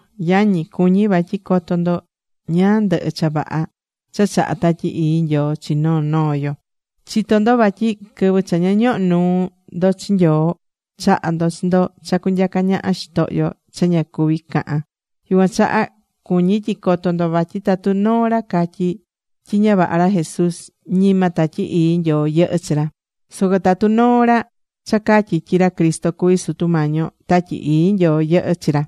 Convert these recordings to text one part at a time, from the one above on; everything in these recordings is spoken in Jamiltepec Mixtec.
Yañi, cuñí vatyi coto ndo ñáá ndɨhɨ cha vaha cha chahá Tatyi Ii Nyoo chi noo noo yo. Chitó ndo vatyi quɨvɨ cha ña ñoho̱ nuu ndo chi Nyoo, chaha̱ ndo chi ndo cha cunyaca ñaha xitohyo cha ña cuví cahan. Yucuan chaha cuñí tyi coto ndo vatyi tatu noo ra catyí tyi ña vaha ra Jesús, ñima Tatyi Ii Nyoo yɨhɨ́ chi ra. Soco tatu noo ra cha catyí tyi ra Cristo cuví Sutu Mañi yo, Tatyi Ii Nyoo yɨhɨ́ chi ra.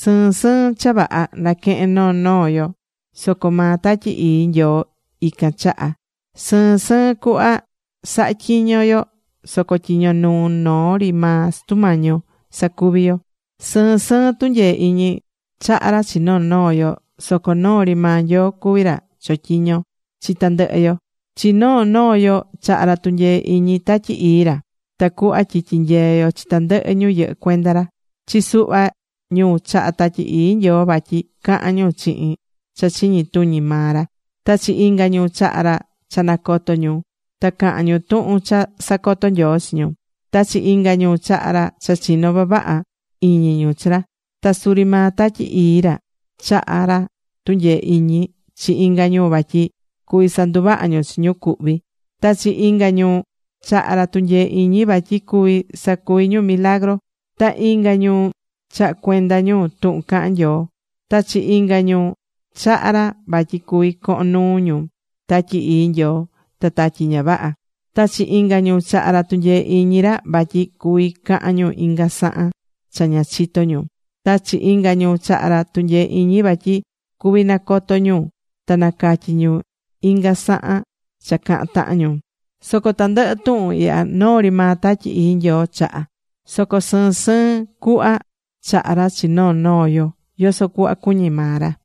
Sɨɨn sɨɨn cha vaha naquehén noo noo yo, soco maa Tatyi Ii Nyoo ican chahá. Sɨɨn sɨɨn cuhva sahá tyiño yo soco tyiño nuu noo ri maa Sutu Mañi yo sacuví yo. Sɨɨn sɨɨn tunyee iñi chaha̱ ra chi noo noo yo. Soco noo ri maa Nyoo cuví ra chotyiñó chi tandɨhɨ yo. Chi noo noo yo chaha̱ ra tunyee iñi Tatyi Ii ra, tacuhva tyi tyinyeé yo chi tandɨhɨ ñu yɨhɨ́ cuenda ra. Chi suhva ñu chaha̱ Tatyi Ii Nyoo vatyi cahán ñu chihin cha chiñi tuñi maa ra. Ta chi inga ñu chahá ra cha nacoto ñu ta cahan ñu tuhun cha sacotó Nyoo chi ñu. Ta chi inga ñu chaha̱ ra cha chinó vavaha iñi ñu chi ra. Ta suri maa Tatyi Ii ra chaha̱ ra tunyee iñi chi inga ñu vatyi cuví sanduvaha ñu chi ñu cuhví. Ta chi inga ñu chaha̱ ra tunyee iñi vatyi cuví sacuvi ñu milagru. Ta inga ñu chahá cuenda ñu tuhun cahán Nyoo. Ta chi inga ñu chaha̱ ra vatyi cuví cohon nuu ñu Tatyi Ii Nyoo ta tatyi ña vaha. Ta chi inga ñu chaha̱ ra tunyee iñi ra vatyi cuví cahan ñu inga sahan cha ña chitó ñu. Ta chi inga ñu chaha̱ ra tunyee iñi vatyi cuví nacoto ñu ta nacatyí ñu inga sahan cha cahán tahan ñu. Soco tandɨhɨ tuhun ihya, noo ri maa Tatyi Ii Nyoo chahá. Soco sɨɨn sɨɨn cuhva chahá ra chi noo noo yo, yoso cuhva cuñí maa ra.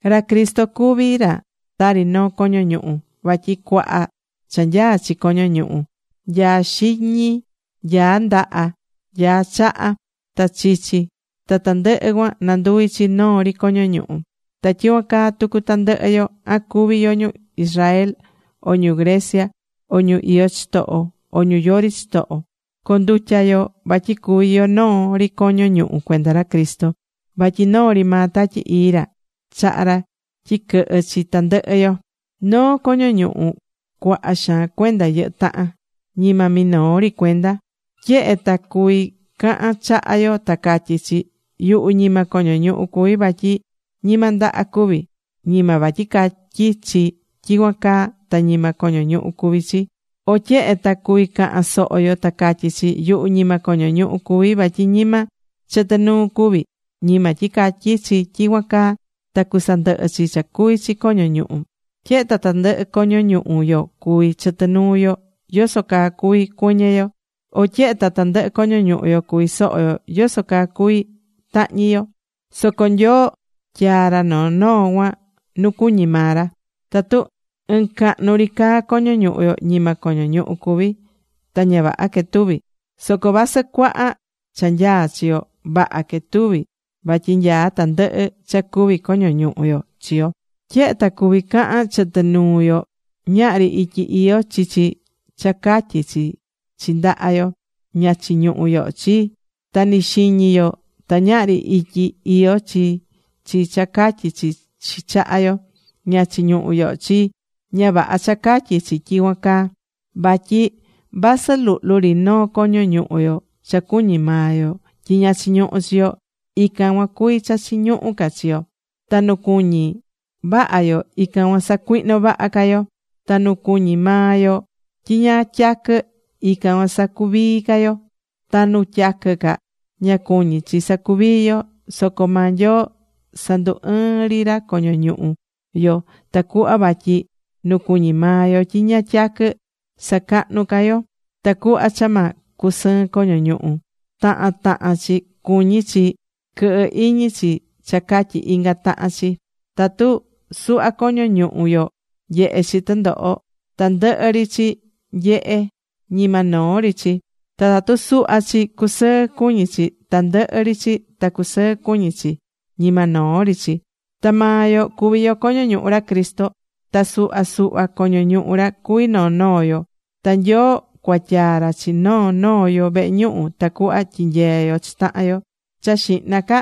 Ra Cristo cuví ra tari noo coño ñuhu. Vatyi cuaha cha nyaá chi coño ñuhu. Nyaá xiñi. Nyaá ndaha. Nyaá chaha. Ta chichi cha tandɨhɨ cuan nanduví chi noo ri coño ñuhu. Ta tyicuan caa tucu tandɨhɨ yo, an cuví yo ñu Israel, o ñu Grecia, o ñu iyó chitoho, o ñu yori chitoho, condutya̱ yo vatyi cuvi yo noo ri coño ñuhu cuenda ra Cristo. Vatyi noo ri maa Tatyi Ii ra chahá ra tyi quɨhɨ́ chi tandɨhɨ yo. Noo coño ñuhu cuaha xaan cuenda yɨhɨ́ tahan. Ñima minoo ri cuenda. Tyehe ta cuví cahan chaha yo ta catyí chi: “Yuhu ñima coño ñuhu cuví vatyi ñima ndaha cuví.” Ñima vatyi catyí chi tyicuan caa ta ñima coño ñuhu cuví chi. O tyehe ta cuví cahan soho yo ta catyí chi: “Yuhu ñima coño ñuhu cuví vatyi ñima chɨtɨ nuu cuví.” Ñima tyi catyí chi tyicuan caa ta cusandɨhɨ chi cha cuví chi coño ñuhu. Tyehe ta tandɨhɨ coño ñuhu yo cuví chɨtɨ nuu yo, yoso caa cuví cuɨñɨ yo. O tyehe ta tandɨhɨ coño ñuhu yo cuví soho yo, yoso caa cuví tahñi yo. Soco Nyoo tyaa̱ ra noo noo cuan nu cuñí maa ra. Tatu ɨɨn cahnu ri caa coño ñuhu yo, ñima coño ñuhu cuví. Ta ña vaha quetuví. Soco vasɨ cuaha cha nyaá chi yo, vaha quetuví vatyi nyaá tandɨhɨ cha cuví coño ñuhu chi yo. Tyehe ta cuví cahan chɨtɨ nuu yo, ñahri ityi iyó chi chi cha catyí chi chi ndaha yo: “Ña chiñuhú yoho chii.” Ta ni xiñi yo ta ñahri ityi iyó chi chi cha catyí chi chi chaha yo: “Ña chiñuhú yoho chii.” Ña vaha cha catyí chi tyicuan caa. Vatyi vasɨ luhlu ri noo coño ñuhu yo cha cuñí maa yo tyi ña chiñuhú chi yo, ican cuan cuví cha chiñuhú ca chi yo. Ta nu cuñí vaha yo, ican cuan sacuihnó vaha ca yo. Ta nu cuñí maa yo tyi ña tyaquɨ, ican cuan sacuvií ca yo. Ta nu tyaquɨ ca, ña cuñí chi sacuvii yo. Soco maa Nyoo sandu ɨɨ̱n ri ra coño ñuhu yo, tacuhva vatyi nu cuñí maa yo tyi ña tyaquɨ, sacahnú ca yo. Tacuhva cha ma cusɨɨn coño ñuhu, tahan tahan chi cuñí chi quɨhɨ iñi chi cha catyi inga tahan chi. Tatu suhva coño ñuhu yo nyehé chi tɨndoho, tandɨhɨ ri chi nyehé, ñima noo ri chi. Ta tatu suhva chi cusɨɨ cuñi chi, tandɨhɨ ri chi ta cusɨɨ cuñi chi, ñima noo ri chi. Ta maa yo cuví yo coño ñuhu ra Cristo. Ta suhva suhva coño ñuhu ra cuví noo noo yo. Ta Nyoo cuatyaa ra chi noo noo yo vehe ñuhu tacuhva tyinyeé yo chi tahan yo. Cha xihna ca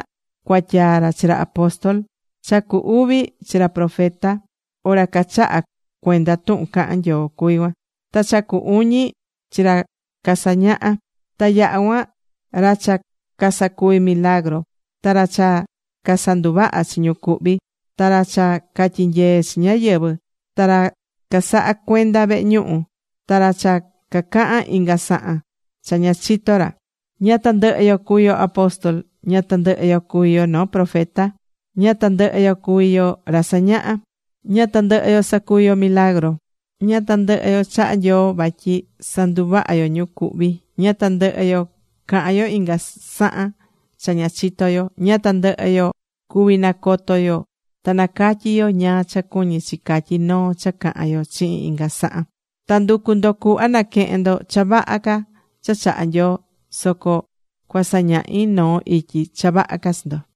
cuatyaa ra chi ra apóstol. Cha cu uvi, chi ra profeta, o ra cachahá cuenda tuhun cahán Nyoo cuví cuan. Ta cha cu uñi, chi ra casañahá. Ta yaha cuan, ra cha casacuví milagru, ta ra cha casanduvahá chi ñu cuhví, ta ra cha catyinyeé chi ñáyɨvɨ, ta ra casahacuendá vehe ñuhu, ta ra cha cacahán inga sahan cha ña chitó ra. Ña tandɨhɨ yo cuví yo apóstol. Ña tandɨhɨ yo cuví yo noo profeta. Ña tandɨhɨ yo cuví yo ra sañaha. Ña tandɨhɨ yo sacuví yo milagru. Ña tandɨhɨ yo chahá Nyoo vatyi sanduvahá yo ñu cuhví. Ña tandɨhɨ yo cahán yo inga sahan cha ña chitó yo. Ña tandɨhɨ yo cuví nacoto yo ta nacatyi yo ñáá cha cuñí chi catyí noo cha cahán yo chihin inga sahan. Ta ndu̱cu ndo cuhva na̱quehen ndo cha vaha ca cha chahá Nyoo. Soco cuasañahi noo ityi cha vaha ca chi ndo.